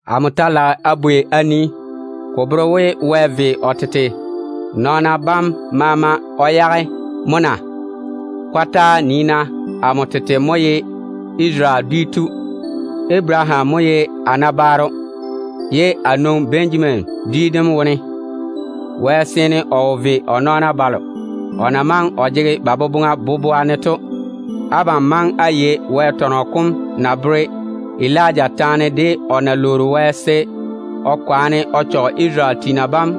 Amo ta lage a bwei a nii, ko bere we Wɛ ve o tete nɔɔna bam maama o yage mo na? Kɔtaa! Nii-na, amo tete mo ye Isarele dwi tu. Abaraham mo ye a nabaaro, ye a nwoŋi Benjamin dwi dem wone. Wɛ seene o wo ve o nɔɔna balo o na maŋe o jege ba boboŋa boboa ne to. Abam maŋe á yei Wɛ tɔnɔ kom na bere Elija taane tei to. O déem lwoori Wɛ se o waare Isarele tiina bam,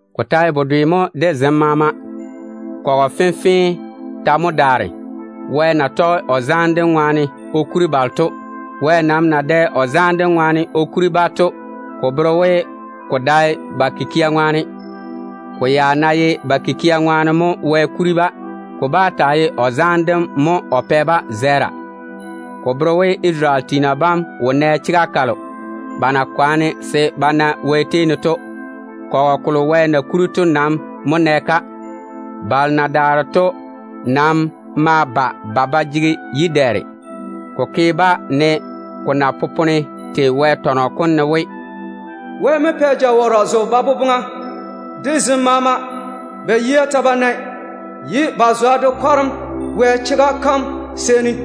Ko ta ye bedwe mo de zem maama. Kɔgɔ fenfee ta mo daare, Wɛ na tɔge o zaane dem ŋwaane o kuri balo to. Wɛ nam na dɛ o zaane dem baŋa ne o kuri-ba to, ko bere we ko dae ba kikia ŋwaane. Ko ya ná ye ba kikia ŋwaane mo o kuri-ba, ko bá taa ye o zaane dem mo o pɛ-ba zɛɛra. Ko bere we Isarele tiina bam wo nɛ chega kalo ba na seene ba yia se ba na Wɛ tei ne to. Kɔgɔ kolo Wɛ na kuri to nam mo nɛ-ka. Balo na daare to nam maa jege yi-dɛɛre. Ko ke-ba ne ko na popone tei Wɛ tɔnɔ kom ne we: “Wɛ mo pɛ se ba tiini ba dɔ ba kɛ. De zem maama, ba yia ta ba nae, ye ba zwa de kwareme Wɛ chega kam seeni.”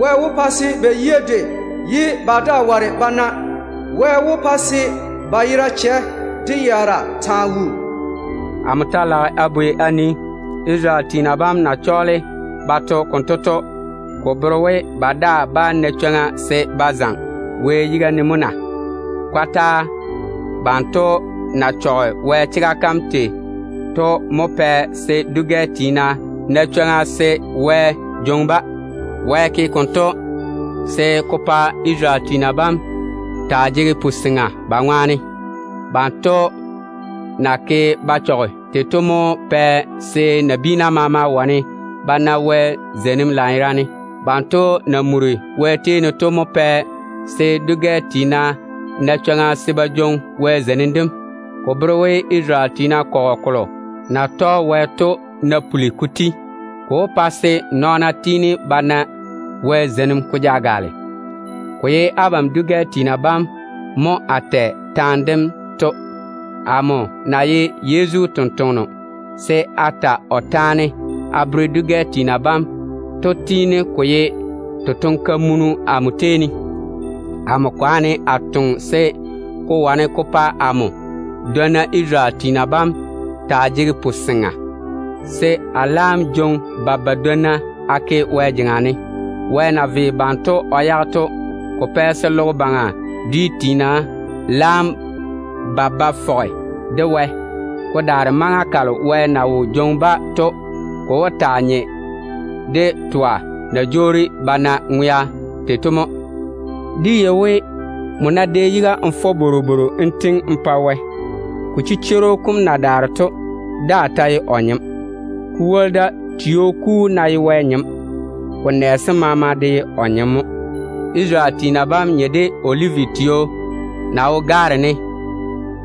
Wɛ wó pa se ba yia dwei ye ba daa ware ba nae. Wɛ wó pa se ba yera chɛ de yaara taa wuu.” Amo ta lage a bwei a nii, Isarele tiina bam na chɔɔle ba to konto to, ko bere we ba daa bá na chwoŋa se ba jwoori ba zaŋe mo na? Kɔtaa! Banto na chɔge Wɛ chega kam tei to mo pɛ se dwi-gɛ tiina na chwoŋa se Wɛ jwoŋi-ba. Wɛ ke konto se ko pa Isarele tiina bam taa jege kazwe ba ŋwaane. Banto na ke ba chɔge tei to mo pɛ se nabiina maama wane ba na Wɛ zeinim lanyerane. Ba na muri Wɛ tei ne to mo pɛ se dwi-gɛ tiina na chwoŋa se ba jwoŋi Wɛ zeinim dem. Ko bere we Isarele dwi tiina kɔgɔ kolo na tɔge Wɛ to ná puli ko ti, ko wó pa se nɔɔna tiini ba na Wɛ zeinim ko ja gaale. Ko ye abam dwi-gɛ tiina bam mo a tɛ taane dento. Amo na ye Yezu totoŋa nakwe se a ta o taane a bere dwi-gɛ tiina bam to tiini ko ye totoŋ-kamunu amo tei ne. Amo kwaane a toŋe se ko wane ko pa amo dwonna Isarele tiina bam taa jege puseŋa, se a laam jwoŋi ba badwonna a ke Wɛ jeŋa ne. Wɛ na ve banto o yage to, ko pɛ se logo baŋa dwi tiina laam ba ba fɔge de Wɛ. Ko daare maŋa kalo Wɛ na wó jwoŋi-ba to, ko wó taa nye de twa na jwoori ba na ŋwea tei to mo. Dé yei we, nmo ná dɛ yiga n fɔ bworobworo n tiŋi n pa Wɛ, ko chichworo kom na daare to daa ta ye o nyem. Ko woli da, tio kuu ná ye Wɛ nyem, ko nɛ sem maama de ye o nyem mo. Isarele tiina bam nye de Olivi tio ba na jeiri gaare wone to.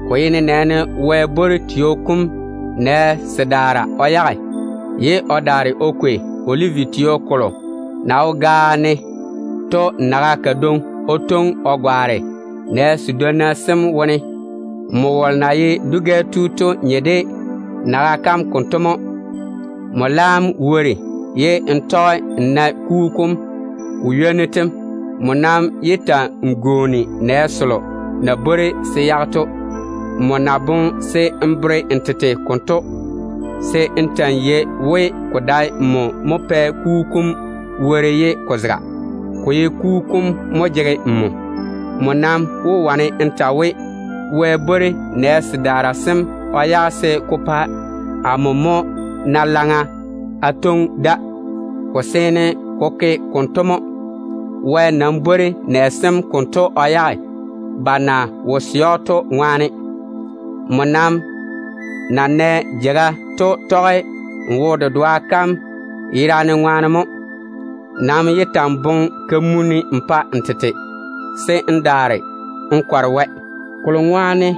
Ko ye nenɛɛne Wɛ bwori tio kom konto nɛ sedaara o yage, ye o daare o kwei Olivi tio kolo na wo gaao wone to naga kadwoŋi o twoŋi o gwaane nɛ sedwonna sem wone. Nmo wolo na ye dwi-gɛ tu to nye de naga kam konto mo. Nmo laam wori ye n tɔge n nae tio kom kugu kom nyoa kam. Nmo nam yé ta‑n gwooni nɛ selo na bwori se yage to. Nmo ná boŋe se n bere n tete konto, se n ta‑n yei we, ko dae nmo mo pae tio kom kugu kom wori ye ko zega. Ko ye kugu kom mo jege nmo ko teila. Nmo nam wó wane n ta we, “Wɛ bwori nɛ sedaara sem o yage tega ne se ko pa amo mo na laŋa a twoŋi da.” Ko seene ko ke konto mo. Wɛ nam bwori nɛ sem konto o yage ba na wo sɛ‑o to ŋwaane. Nmo nam na nɛ jeiga to tɔge n wo-dedoa kam yerane ŋwaane mo. Nam yé ta‑n boŋe kamunim n pa n tete, se n daare n kɔre Wɛ de foone. Kolo ŋwaane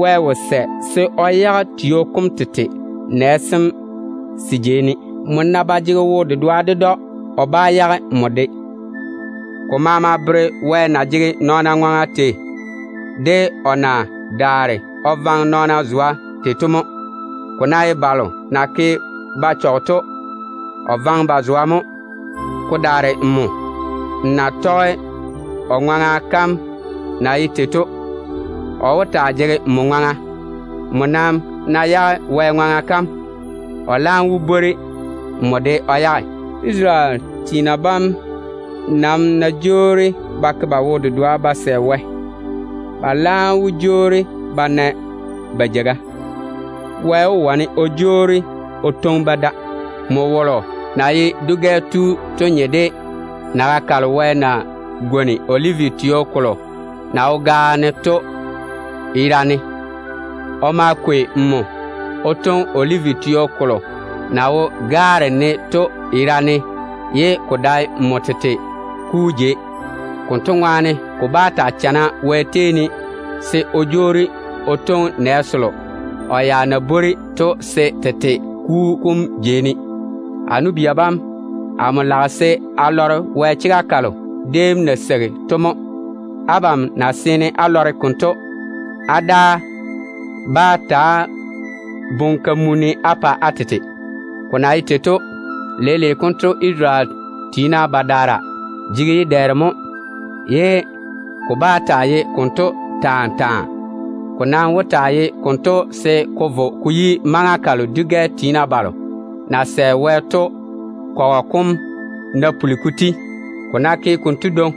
Wɛ wo sɛ se o yage tio kom tete nɛ sem se jei ne. Nmo ná ba jege wo-dedoa ded‑o, o bá yage nmo de. Ko maama bere Wɛ na jege nɔɔna ŋwaŋa tei, de o na daare o vaŋe nɔɔna zwa tei to mo. Ko ná ye balo na ke ba chɔge to, o vaŋe ba zwa mo. Ko daare nmo, n ná tɔge o ŋwaŋa kam na ye tei to, o wó taa jege nmo ŋwaŋa. Nmo nam ná yage Wɛ ŋwaŋa kam, o laam wó bwori nmo de o yage tega ne. Isarele tiina bam nam ná jwoori ba ke ba wo-dedoa ba sɛ Wɛ, ba laam wó jwoori ba na ba jeiga. Wɛ wó wane o jwoori o twoŋi-ba da. Nmo wolo na ye dwi-gɛ tu to nye de naga kalo Wɛ na gwoni Olivi tio kolo na wo gaao ne to yera ne. O ma kwei nmo o twoŋi Olivi tio kolo na jeiri gaare ne to yera ne ye ko dae nmo tete kuu jei. Konto ŋwaane ko bá taa chana Wɛ tei ne se o jwoori o twoŋi nɛ selo o ya na bwori to se tete kuu kom jei ne. A nu-bia bam, amo lage se á lɔre Wɛ chega kalo déem na seigi to mo. Abam ná seene á lɔre konto, á daa bá ta‑á boŋe kamunim á pa á tete. Ko na ye tei to, leile konto Isarele tiina badaara jege yi-dɛɛre mo, ye ko bá taa ye konto taa taa. Ko nam wó taa ye konto se ko vo ko yi maŋa kam dwi-gɛ tiina balo na sɛ Wɛ to kɔgɔ kom ná puli ko ti. Ko ná ke konto dwoŋi,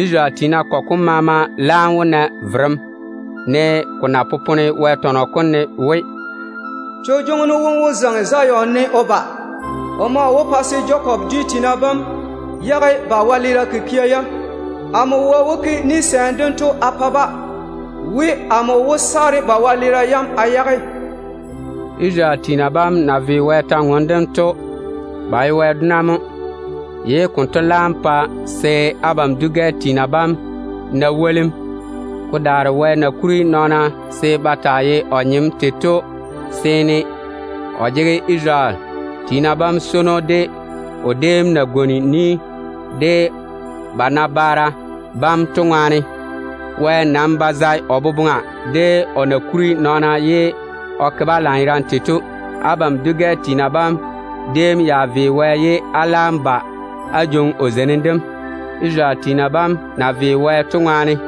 Isarele tiina kɔgɔ kom maama laam wó na verem, ne ko na popone Wɛ tɔnɔ kom ne we: “Vereno wom wó zaŋe Zion ne o ba. O maa wó pa se Jakob Jakob ye Isarele yere dedwoŋi. dwi tiina bam yage ba wɛleera kikia yam. Amo Wɛ wó ke ni-gwonim dento a pa-ba we, amo wó saare ba wɛleera yam a yage.” Isarele tiina bam na ve Wɛ kwor-ywoŋa kam to, ba ye Wɛ dona mo, ye konto laam pa se abam dwi-gɛ tiina bam na wolim. Ko daare Wɛ na kuri nɔɔna se ba taa ye o nyem tei to seeni, o jege Isarele tiina bam swono, o déem na gwoni ni de ba nabaara bam to ŋwaane. Wɛ nam ba zae o boboŋa de o na kuri nɔɔna ye o ke-ba lanyerane tei to. Abam dwi-gɛ tiina bam déem ya ve Wɛ ye á laam ba á jwoŋi o zeinim dem, Isarele tiina bam na ve Wɛ to ŋwaane.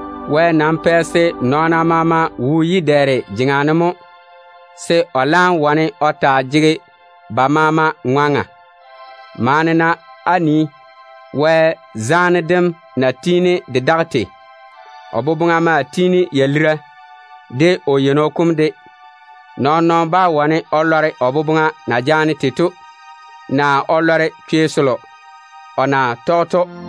Wɛ nam pɛ se nɔɔna maama wo yi-dɛɛre jeŋa ne mo, se o laam wane o taa jege ba maama ŋwaŋa. Maane-na á nii Wɛ zaane dem na tiini de daga tei! O boboŋa maa tiini ya lira, de o yeino kom de. Nɔɔn-nɔɔno bá wane o lɔre o boboŋa na jaane tei to naa o lɔre chwei selo o na tɔge to.